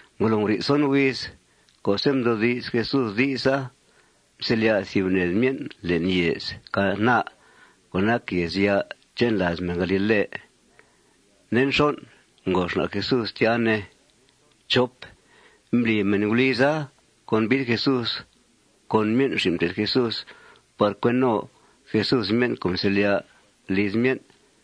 Ngolo nguri'th son huiz co'se' mdoodi's Jesús di'sa, mselya' thìb ned myen' le'n yèez Caná co' nac yèezya' che'n làaz mèn galile. Nde nxon', ngo xna' Jesús tya, ne. Mbli mèn guliza convid Jesús con myen' xin' mté'th Jesús par cue no Jesús myen' co' mselya'a liz myen'.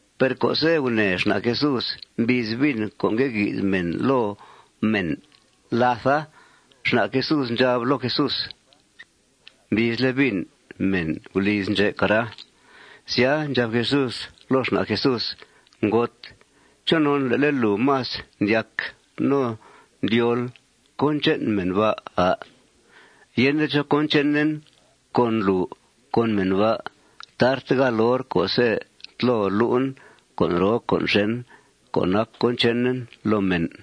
Per co'se' gunèe xna' Jesús mbiiz vin co' ngue gui'th mèn loo mèn làtha, xna' Jesús ndxab loo Jesús: ―Mbiizle' vin mèn guliz ndxè', cara. Sya, ndxab Jesús loo xna' Jesús: ―Ngot, ¿chonon le'le' lùu más ndyac no ndyóol cón che'n mèn ba', à'? Yende chó cón chenen con lùu con mèn ba'. Tarte gáal hor co'se' tlo lu'en con' roo con' xèn co' nac cón chenen loo mèn.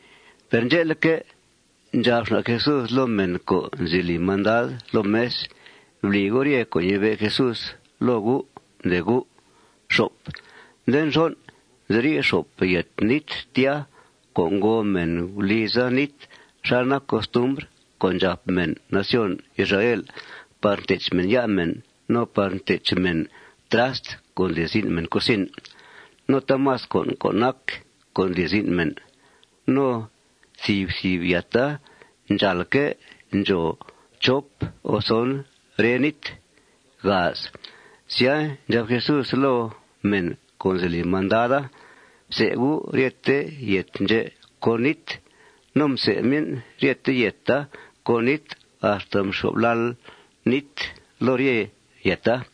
Per ndxe'leque', ndxab xna' Jesús loo mèn co' nzi li mandad loo mes: ―Bli gu' rye con' ñee Jesús loo gu', ndee gu'. Nde nxon', nziri' xop yèt nít tya co' ngòo mèn guliza nít xal nac costumbr co' ndxàp mèn nación Israel par ntech mèn ya' mèn, no par ntech mèn trast co' ndli zin' mèn cusin, no taamas con' co' nac co' ndli zin' mèn. No thìb thìb yèta ndxàalque' ndxòo chop o son rre nít. Sya, ndxab Jesús loo mèn co' nzi li mandada: ―Fsè gu' ryete yèt ndxè' con nít. No msè myen' rye yèta con nít axta mxyo'f lal nít loo rye yèta.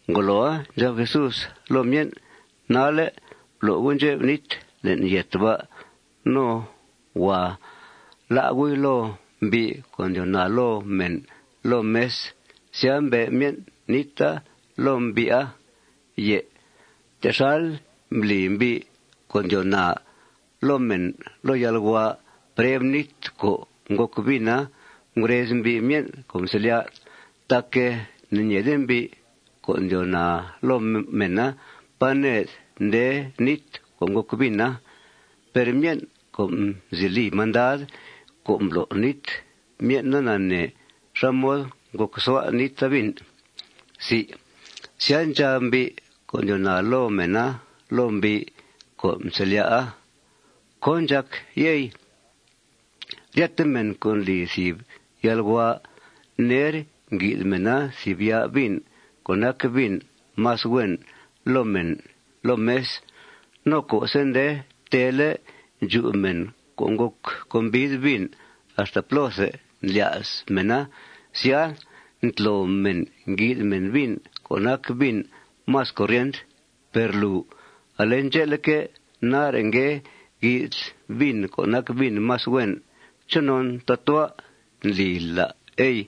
Ngoloa, ndxab Jesús loo myen': ―Nalle', blo' gu' ndxep nít le'n yèt ba'. No huàa lá' gu'i loo mbi' co' ndyoo naa loo mèn loo mes. Sya, mbe' myen' níta loo mbi'a. Per texal mbli mbi' co' ndyoo naa loo mèn loo yalhua preb nít co' ngòc vina, ngurez mbi' myen' co' mselya'. Tac ne'ñeede mbi' co' ndyoo naa loo mèna pá ned nde nít co' ngòc vina. Per myen' co' nzi li mandad co' mblo' nít, myen'a nanee xá mod ngòcsua' níta vin. Sya, ndxab mbi' co' ndyoo naa loo mèna loo mbi' co' mselya'a: ―¿Cón ndxàc, yey? Ryete mèn co' ndli thìb yalhua, ner ngui'th mèna thìb ya' vin co' nac vin más huen loo mèn loo mes. No co'se' nde teele' ndxu mèn co' ngòc convid vin axta plóthe ndlya's mèna, sya, ntlo mèn, ngui'th mèn vin co' nac vin más corient. Per lùu, ale ndxe'leque', nare' ngue gui'thl vin co' nac vin más huen. ¿Chonon tatua' ndlila, ey?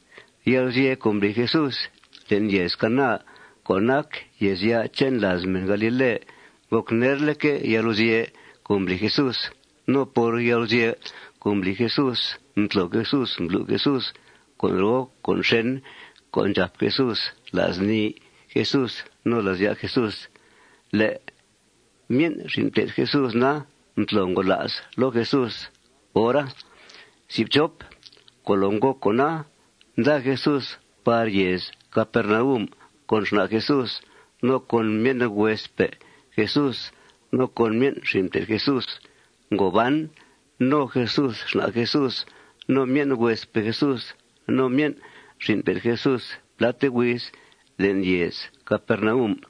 Yalguzye' co' mbli Jesús le'n yèez Caná co' nac yèezya' che'n làaz mèn galile ngòc nerleque' yalguzye' co' mbli Jesús. No por yalguzye' co' mbli Jesús, mtlo Jesús, mblu' Jesús con' roo con' xèn co' ndxàp Jesús la's nii Jesús no la's ya' Jesús. Le' myen' xin' mté'th Jesús na, mtlo ngola's loo Jesús hora. Ngolo ngòc con'a, nda Jesús par yèez Capernaum con xna' Jesús, no con myen' huespe' Jesús, no con myen' xin' mté'th Jesús. Ngo ban no Jesús xna' Jesús, no myen' huespe' Jesús, no myen' xin' mté'th Jesús pláte huiz le'n yèez Capernaum.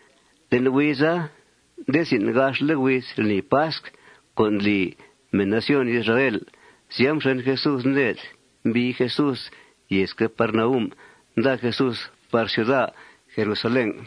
Le'n huiza, nde zin' gaxle' huiz lnii pasc co' ndli mèn nación Israel. Sya, mxen Jesús ned. Mbii Jesús yèez Capernaum. Nda Jesús par ciuda Jerusalén.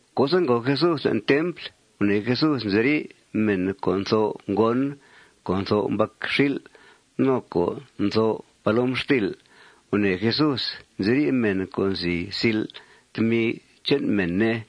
Co'se' ngòo Jesús le'n templ, gunèe Jesús nziri' mèn co' ntho' ngon, co' ntho' mbacxil', no co' ntho' palomxtil'. Gunèe Jesús nziri' mèn co' nzi sil' tmi che'n mèn, ne.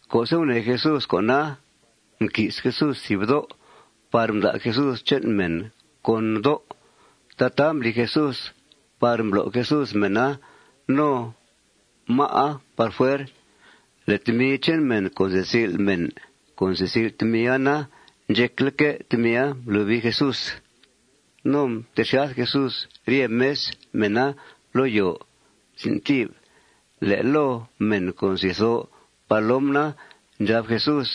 Co'se' gunèe Jesús con'a, mqui's Jesús thìb dó' par mda' Jesús che'n mèn con dó'. Tataa mbli Jesús par mblo' Jesús mèna no má'a par fuer. Le' tmi che'n mèn co' nzi sil' mèn co' nsil' tmia na, ndxecleque' tmia mblobii Jesús. No mtexyath Jesús rye mes mèna loo yòo. Le' loo mèn co' nzi tho' palom na, ndxab Jesús: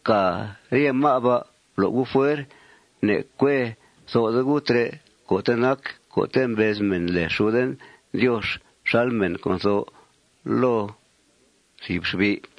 ―Fcàa rye má' ba. Blo' gu' par fuer. Ne'cue tho'de gu' trè' co'te' nac co'te' mbez mèn lèe xuden Diox xal mèn co' ntho' loo thìb xbi'.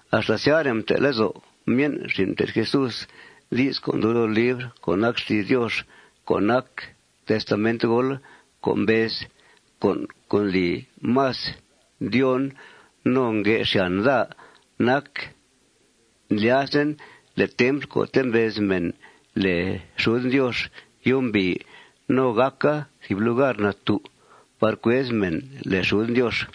Axta syare' mte' lezo' myen' xin' mté'th Jesús di's co' ndub loo libr co' nac xti's Diox co' nac testamentgool co' mbez: Con' co' ndli más ndyóon no ngue xyàn daa nac ndlyazen le' templ co'te' mbez mèn lèe xuden Diox yumbìi no gàca thìb lugar natú' par cuez mèn lèe xuden Diox.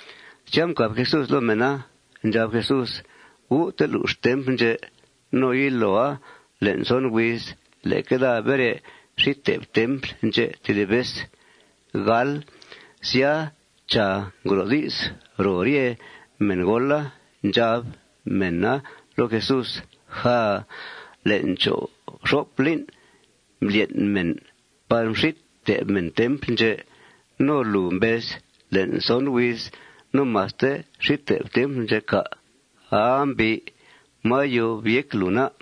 Sya, mcàb Jesús loo mèna. Ndxab Jesús: ―Gu' telux templ ndxè' no yiloa le'n son huiz leque daa bere xít te'f templ ndxè' tedib vez. Sya, chàa, ngro' di's ro rye mèngoola. Ndxab mèna loo Jesús: ―Jaaa. Le'n cho' fxop lín' mblyen' mèn par mxít te'f mèn templ ndxè'. ¿No lùu mbez: Le'n son huiz no maste xít te'fl templ, cà'? Aa, mbi'. ¿Máa yob yéc lùu, na?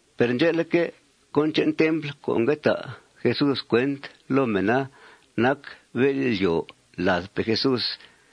Per ndxe'leque', cón che'n templ co' ngue ta' Jesús cuent loo mèna nac bél'yòo ladpe' Jesús.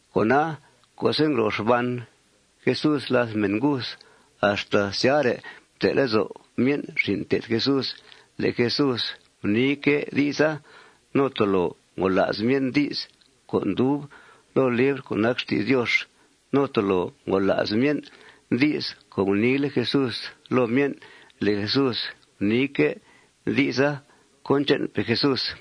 Cona, co'se' ngro xban Jesús làth mèn nguth, axta syare' mte' lezo' myen' xin' mté'th Jesús le' Jesús guniique' di'sa. No tolo ngola's myen' di's co' ndub loo libr co' nac xti's Diox. No tolo ngola's myen' di's co' guniile' Jesús loo myen' le' Jesús guniique' di'sa cón che'npe' Jesús.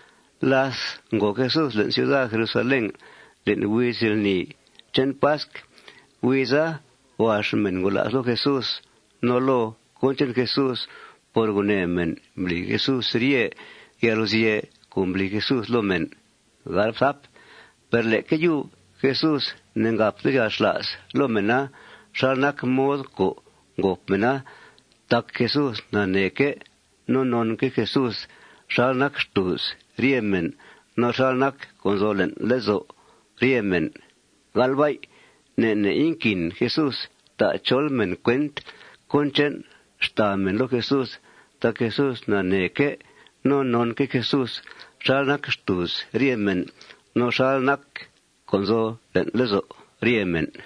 Láth ngo Jesús le'n ciuda Jerusalén le'n huiz lni che'n pasc, huiza huax mèn ngola's loo Jesús no loo cón che'n Jesús por gunèe mèn mbli Jesús rye yalguzye' co' mbli Jesús loo mèn. Per leque yub Jesús ne'ngàpte yalxla's loo mèna xal nac mod co' ngòp mèna. Tac Jesús naneeque' no nonque' Jesús xal nac xtùuz rye mèn no xal nac co' nzo le'n lezo' rye mèn. Ne' ne' inquin Jesús ta' chol mèn cuent cón che'n xtàa mèn loo Jesús tac Jesús naneeque' no nonque' Jesús xal nac xtùuz rye mèn no xal nac co' nzo le'n lezo' rye mèn.